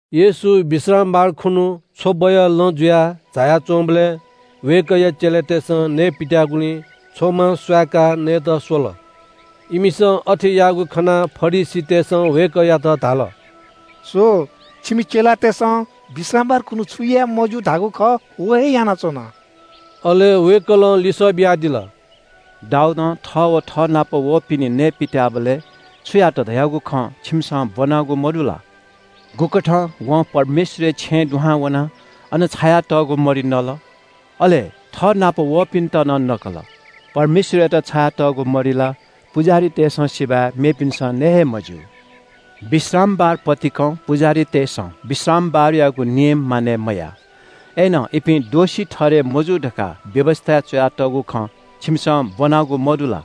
येशू विश्रामबार खुन्‍हु छ्वबया लँ जुयाः झाया च्‍वंबलय् वय्‌कःया चेलातय्‌सं नये पित्‍याःगुलिं छ्वमा स्‍वहाय्‌काः नयेत स्‍वल। इमिसं अथे याःगु खनाः फरिसीतय्‌सं वय्‌कःयात धाल – “स्‍व, छिमि चेलातय्‌सं विश्रामबार खुन्‍हु छु याये मज्‍यू धाःगु खः व हे यानाच्‍वन।” अले वय्‌कलं लिसः बियादिल – “दाऊदं थः व थःनाप वःपिनि नये पित्‍याःबलय् छु यात धयागु खँ छिमिसं ब्‍वनागु मदु ला? गुकथं वं परमेश्‍वरया छेँय् दुहां वनाः अन छायातःगु मरि नल? अले थःनाप वःपिन्‍त नं नकल। परमेश्‍वरयात छायातःगु मरि ला पुजाहारीतय्‌सं सिबय् मेपिन्‍सं नये हे मज्‍यू। विश्रामबार पतिकं पुजाहारीतय्‌सं विश्रामबारयागु नियम मानय् मयाः। अय्‌नं इपिं दोषी ठहरय् मजू धकाः व्‍यवस्‍थाय् च्‍वयातःगु खँ छिमिसं ब्‍वनागु मदु ला?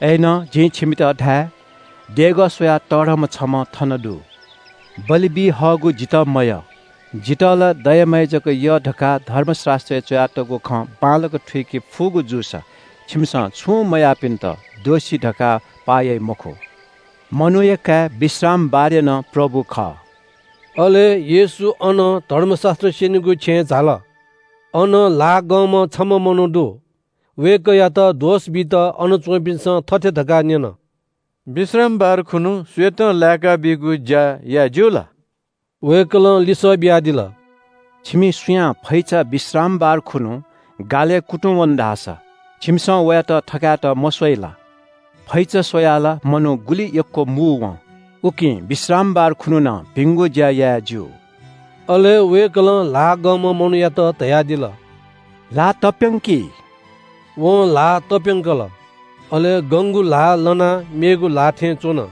अय्‌नं जिं छिमित धाये – देगः स्‍वयाः तःधंम्‍ह छम्‍ह थन दु। ‘बलि बी हःगु जितः मयः, जितः ला दया माया जक यः’ धकाः धर्मशास्‍त्रय् च्‍वयातःगु खँ बांलाक थुइके फुगु जूसा छिमिसं छुं मयाःपिन्‍त दोषी धकाः पाः याइ मखुगु। मनूया काय् विश्रामबारया नं प्रभु खः।” अले येशू अनं धर्मशास्‍त्र स्‍यनीगु छेँय् झाल। अन ल्‍हाः गंम्‍ह छम्‍ह मनू दु। वय्‌कःयात दोष बीत अन च्‍वंपिन्‍सं थथे धकाः न्‍यन – “विश्रामबार खुन्‍हु सुयातं लाय्‌काबीगु ज्‍या याये ज्‍यू ला?” वय्‌कलं लिसः बियादिल – “छिमि सुयां फैचा विश्रामबार खुन्‍हु गालय् कुतुंवन धाःसा छिमिसं वयात थकायेत मस्‍वइ ला? फैचा स्‍वयाः ला मनू गुलि यक्‍व मू वं। उकिं विश्रामबार खुन्‍हु नं भिंगु ज्‍या याये ज्‍यू।” अले वय्‌कलं ल्‍हाः गंम्‍ह मनूयात धयादिल – “ल्‍हाः तप्‍यंकि।” वं ल्‍हाः तप्‍यंकल। अले गंगु ल्‍हाः लनाः मेगु ल्‍हाः थें च्‍वन।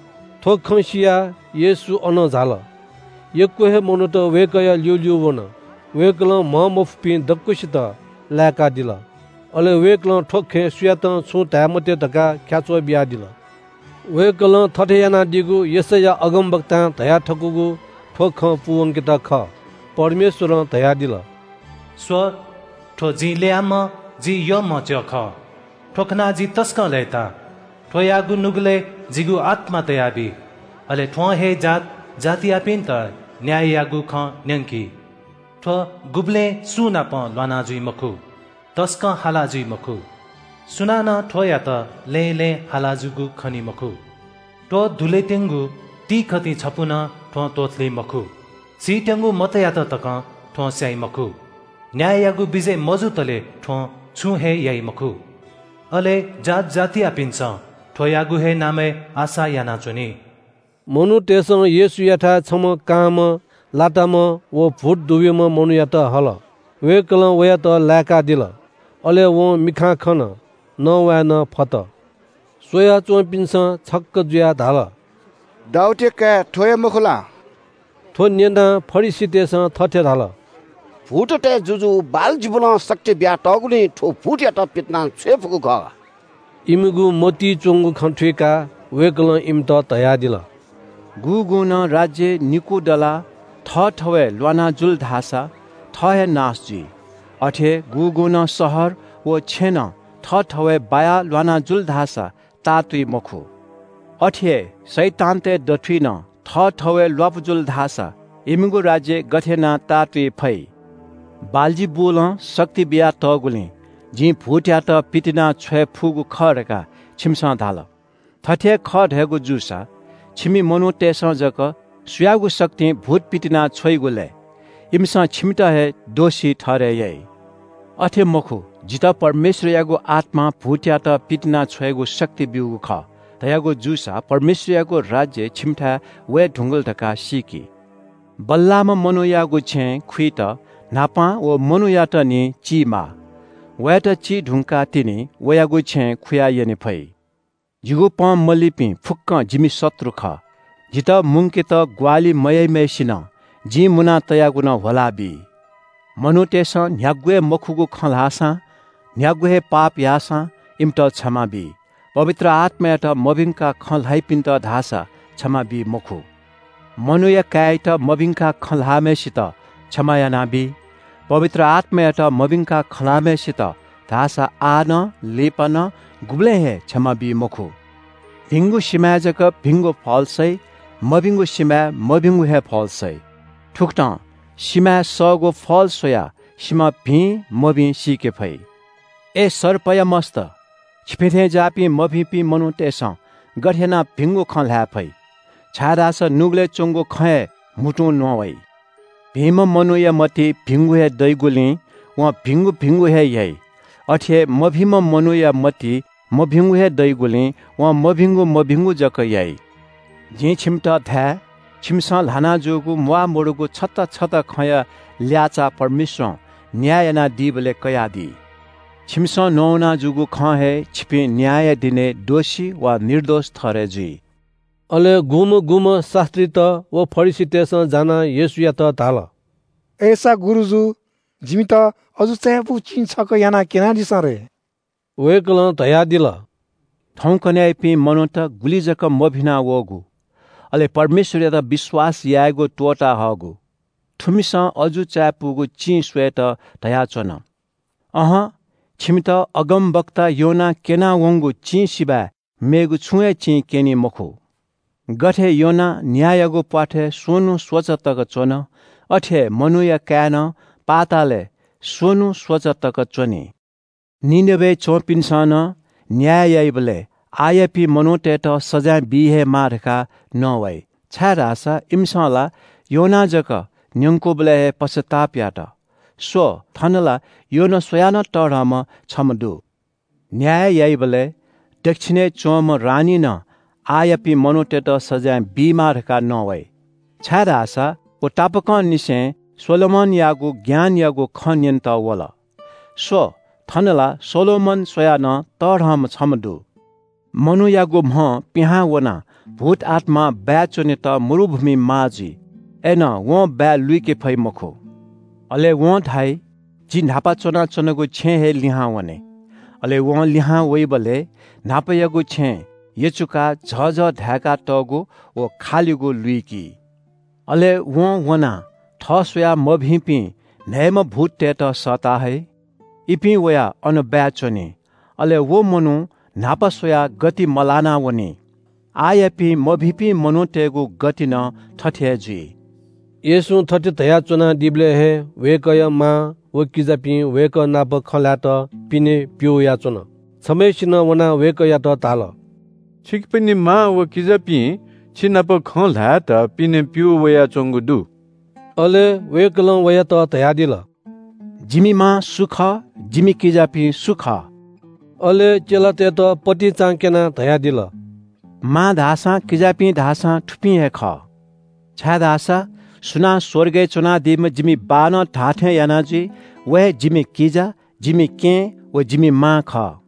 थ्‍व खँ सियाः येशू अनं झाल। यक्‍व हे मनूत वय्‌कःया ल्‍यूल्‍यू वन। वय्‌कलं म्‍हंमफुपिं दक्‍वसित लाय्‌कादिल। अले वय्‌कलं थ्‍व खँय् सुयातं छुं धाये मते धकाः ख्‍याच्‍वः बियादिल। वय्‌कलं थथे यानादीगु यशैया अगमवक्तां धयाथकूगु थ्‍व खँ पूवंकेत खः – परमेश्‍वरं धयादिल – “स्‍व, थ्‍व जिं ल्‍ययाम्‍ह जि यःम्‍ह च्‍यः खः। थ्‍व खनाः जि तसकं लय्‌ताः। थ्‍वयागु नुगलय् जिगु आत्‍मा तयाबी, अले थ्‍वं हे जात जातियापिन्‍त न्‍याययागु खँ न्‍यंकी। थ्‍व गुबलें सुंनाप ल्‍वाना जुइ मखु, तसकं हाला जुइ मखु। सुनानं थ्‍वयात लँय् लँय् हाला जूगु खनी मखु। त्‍वधुलेत्‍यंगु तिंकथि छपु नं थ्‍वं त्‍वथुली मखु। सीत्‍यंगु मतयात तकं थ्‍वं स्‍याइ मखु। न्‍याययागु विजय मजुतले थ्‍वं छुं हे याइ मखु। अले जात जातियापिन्‍सं थ्‍वयागु हे नामय् आशा यानाच्‍वनी।” मनूतय्‌सं येशूयाथाय् छम्‍ह कांम्‍ह लाताम्‍ह व भूत दुब्‍यूम्‍ह मनूयात हल। वय्‌कलं वयात लाय्‌कादिल। अले वं मिखां खन, नवाये नं फत। स्‍वयाच्‍वंपिन्‍सं छक्‍क जुयाः धाल – “दाऊदया काय् थ्‍व हे मखु ला?” थ्‍व न्‍यनाः फरिसीतय्‌सं थथे धाल – “भूततय् जुजु बालजिबुलं शक्ति बियातःगुलिं थ्‍वं भूतयात पितिनाछ्वये फुगु खः।” इमिगु मतिइ च्‍वंगु खँ थुइकाः वय्‌कलं इमित धयादिल – “गुगुं नं राज्‍य निकू दलाः थःथवय् ल्‍वाना जुल धाःसा थः हे नाश जुइ। अथे हे गुगुं नं शहर व छेँनं थःथवय् बायाः ल्‍वाना जुल धाःसा ताःतुइ मखु। अथे हे शैतानतय् दथुइ नं थःथवय् ल्‍वापु जुल धाःसा इमिगु राज्‍य गथे यानाः ताःतुइ फइ? बालजिबुलं शक्ति बियातःगुलिं जिं भूतयात पितिनाछ्वये फुगु खः धकाः छिमिसं धाल। थथे हे खः धयागु जूसा छिमि मनूतय्‌सं जक सुयागु शक्तिं भूत पितिनाछ्वइगु लय्? इमिसं छिमित हे दोषी ठहरय् याइ। अथे मखु, जितः परमेश्‍वरयागु आत्‍मां भूतयात पितिनाछ्वयेगु शक्ति ब्‍यूगु खः धयागु जूसा परमेश्‍वरयागु राज्‍य छिमिथाय् वये धुंकल धकाः सीकि। बल्‍लाःम्‍ह मनूयागु छेँय् खुइत न्‍हापां व मनूयात निं चीमाः। वयात चीधुंकाः तिनि वयागु छेँय् खुयाः यने फइ।” “जिगु पँ मलीपिं फुक्‍क जिमि शत्रु खः। जितः मुंकेत ग्‍वाहालि मयाइम्‍हय्‌सिनं जिं मुना तयागु नं ह्वलाबी। “मनूतय्‌सं न्‍ह्यागु हे मखुगु खँ ल्‍हाःसां न्‍ह्यागु हे पाप याःसां इमित क्षमा बी, पवित्र आत्‍मायात मभिंकाः खँ ल्‍हाइपिन्‍त धाःसा क्षमा बी मखु। मनूया काय्‌यात मभिंकाः खँ ल्‍हाःम्‍हय्‌सित क्षमा यानाबी, पवित्र आत्‍मायात मभिंकाः खँ ल्‍हाःम्‍हय्‌सित धाःसा आः नं, लिपा नं, गुबलें हे क्षमा बी मखु।” “भिंगु सिमाय् जक भिंगु फल सइ। मभिंगु सिमाय् मभिंगु हे फल सइ। थुकथं सिमाय् सःगु फल स्‍वयाः सिमा भिं मभिं सीके फइ। अय् सर्पया मस्‍त, छिपिं थें ज्‍याःपिं मभिंपिं मनूतय्‌सं गथे यानाः भिंगु खँ ल्‍हाये फइ? छाय्‌धाःसा नुगलय् च्‍वंगु खँ हे म्‍हुतुं नवाइ। भिंम्‍ह मनूया मतिइ भिंगु हे दइगुलिं वं भिंगु भिंगु हे याइ। अथे हे मभिंम्‍ह मनूया मतिइ मभिंगु हे दइगुलिं वं मभिंगु मभिंगु जक याइ।” “जिं छिमित धाये – छिमिसं ल्‍हाना जूगु म्‍वाःमदुगु छता छता खँया ल्‍याःचाः परमेश्‍वरं न्‍याय यानादीबलय् कयादी। छिमिसं नवाना जूगु खं हे छिपिं न्‍यायया दिनय् दोषी वा निर्दोष ठहरय् जुइ।” अले गुम्‍हं गुम्‍हं शास्‍त्रीत व फरिसीतय्‌सं जानाः येशूयात धाल – “अय्‌सा गुरुजु, जिमित अजू चायापुगु चिं छकः यानाः क्‍यनादिसँ रे।” वय्‌कलं धयादिल – “थौंकन्‍हय्‌यापिं मनूत गुलि जक मभिना वःगु, अले परमेश्‍वरयात विश्‍वास यायेगु त्‍वःता हःगु। थुमिसं अजू चायापुगु चिं स्‍वयेत धयाच्‍वन। अहं, छिमित अगमवक्ता योनां क्‍यना वंगु चिं सिबय् मेगु छुं हे चिं क्‍यनी मखु। गथे योना न्‍यायागु प्‍वाथय् स्‍वन्‍हु स्‍वचा तक च्‍वन, अथे हे मनूया काय् नं पृथ्‍वीया दुने स्‍वन्‍हु स्‍वचा तक च्‍वनी। “निनवेय् च्‍वंपिन्‍सं नं न्‍याय याइबलय् आःयापिं मनूतय्‌त सजाँय बी हे माः धकाः नवाइ, छाय्‌धाःसा इमिसं ला योनां जक न्‍यंकूबलय् हे पश्‍चाताप यात। स्‍व, थन ला योना स्‍वयाः नं तःधंम्‍ह छम्‍ह दु। न्‍याय याइबलय् दच्‍छिनय् च्‍वंम्‍ह रानीं नं आःयापिं मनूतय्‌त सजाँय बीमाः धकाः नवाइ, छाय्‌धाःसा व तापाकंनिसें सोलोमनयागु ज्ञानयागु खँ न्‍यनेत वल। स्‍व, थन ला सोलोमन स्‍वयाः नं तःधंम्‍ह छम्‍ह दु।” “मनूयागु म्‍हं पिहां वनाः भूतआत्‍मां बाय् च्‍वनेत मरुभूमिइ माः जुइ। अय्‌नं वं बाय् लुइके फइ मखु। अले वं धाइ ‘जि न्‍हापा च्‍वनाच्‍वनागु छेँ हे लिहां वने।’ अले वं लिहां वइबलय् न्‍हापायागु छेँ यचुकाः झःझः धाय्‌कातःगु व खालिगु लुइकी। अले वं वनाः थः स्‍वयाः मभिंपिं न्‍हय्‌म्‍ह भूततय्‌त सःता हइ। इपिं वयाः अन बाय् च्‍वनी। अले व मनू न्‍हापा स्‍वयाः गति मलाना वनी। आःयापिं मभिंपिं मनूतय्‌गु गति नं थथे हे जुइ।” येशूं थथे धयाच्‍वनादीबलय् हे वय्‌कःया मां व किजापिं वय्‌कः नाप खँ ल्‍हायेत पिने प्‍यू वयाच्‍वन। छम्‍हय्‌सिनं वनाः वय्‌कःयात धाल – “छिकपिनि मां व किजापिं छिनाप खँ ल्‍हायेत पिने प्‍यू वयाच्‍वंगु दु।” अले वय्‌कलं वयात धयादिल – “जिमि मां सु खः? जिमि किजापिं सु खः?” अले चेलातय्‌त पतिचां क्‍यनाः धयादिल – “मां धाःसां किजापिं धाःसां थुपिं हे खः। छाय्‌धाःसा सुनां स्‍वर्गय् च्‍वनादीम्‍ह जिमि बाःनं धाःथें याना जुइ व हे जिमि किजा, जिमि केहेँ व जिमि मां खः।”